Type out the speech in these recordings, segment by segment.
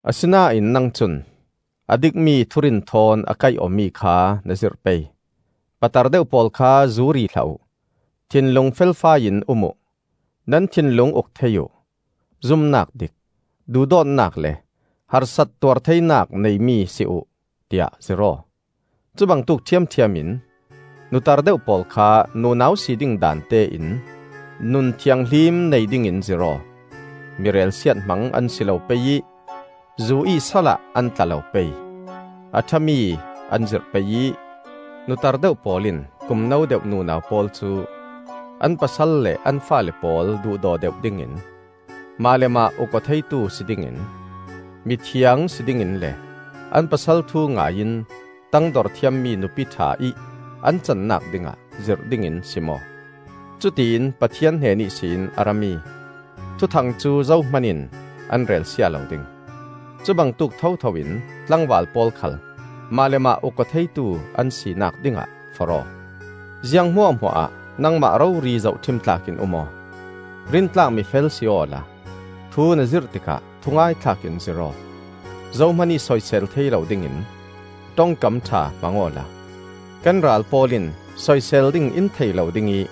Asinain nang cun a dikmi thurin thawn a kaih awmi kha na zirh pei. Patar deuh pawl kha zu ri hlah uh, thinlung felfai in um uh, nan thinlung uk thei uh; zumnak dik, duhdawtnak le harsat tuartheinak neimi si uh, tiah zirh aw. Cubangtuk ṭhiamṭhiam in nutar deuh pawl kha nunau si ding daan te in nun thianghlim nei dingin zirh aw. Mi relsiat hmang an si lo pei ih zu-ih salah an tla lo pei. A ṭhami an zirh pei ih, nutar deuh pawl in kum no deuh nunau pawl cu an pasal le an faale pawl duhdaw deuh dingin, mah le mah uk-aw theitu si dingin, mithiang si dingin le an pasal thu ngai in tangdor thiammi nupi ṭha ih an cannak dingah zirh dingin sim aw. Cutiin Pathian hnen ihsin a rami thuthang cu zohman in an relsia lo ding. Cubangtuk thothoin tlangval pawl khal mah le mah uk-aw theitu an sinak dingah forh aw. Ziang hmuahhmuahah nangmah rori zohṭhim tlak in um aw. Rintlak mifel si awla thu na zirh tikah thungaithlak in zirh aw. Zohman ih soisel thei lo dingin ṭongkam ṭha hmang awla kan ral pawl in soisel ding in thei lo ding ih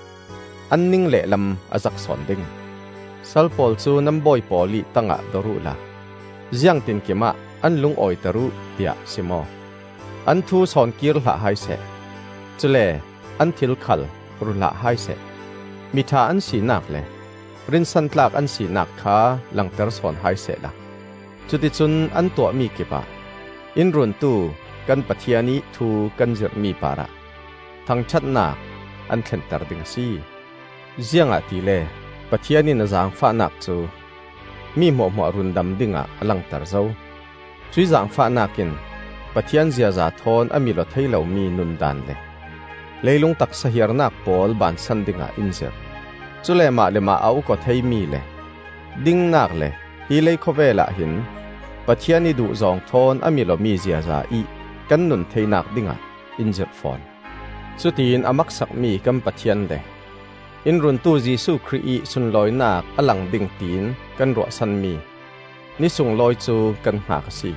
an ning lehlam a zak sawn ding. Sal pawl cu nan bawi pawl ih tangah dor uhla ziangtinkim ah an lungawiter uh, tiah sim aw. An thu sawnkir hlah hai seh. Cule an thil khal ru hlah hai seh. Miṭha an sinak le rinsantlak an sinak kha langter sawn hai sehla, cuticun an tuahmi kipah in Runtu kan Pathian ih thu kan zirhmi parah thangṭhatnak an thlenter ding a si. Ziangahtile Pathian in a zaangfahnak cu mi hmuahhmuah rundam dingah a langter zo. Cuih zaangfahnak in Pathian ziaza thawn a mil-aw thei lomi nun daan le leilung taksa hiarnak pawl baansan dingah in zirh. Cule mah le mah a uk-aw theimi le dingnak le hi leikhawvel ah hin Pathian ih duhzawng thawn a mil-awmi ziaza ih kan nun theinak dingah in zirh fawn. Cutiin a maksakmi kan Pathian le in Runtu Jesuh Khrih ih sunlawinak a lang ding tiin kan ruahsanmi Ni sunglawi cu kan hngak a si.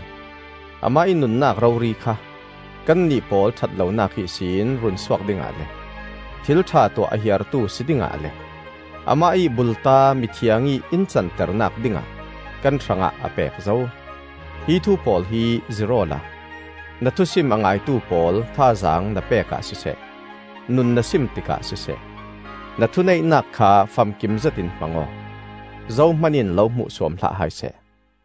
Amah ih nunnak rori kha kannih pawl ṭhatlonak ihsin runsuak dingah le thil ṭha tuah a hiartu si dingah le amah ih bulta mithiang ih in canternak dingah kan hrangah a pek zo. Hi thu pawl hi zirh awla na thusim a ngaitu pawl thazaang na pek ah siseh, nun na sim tikah siseh, na thuneihnak kha famkim zetin hmang aw. Zohman in lo hmuhsuam hlah hai seh.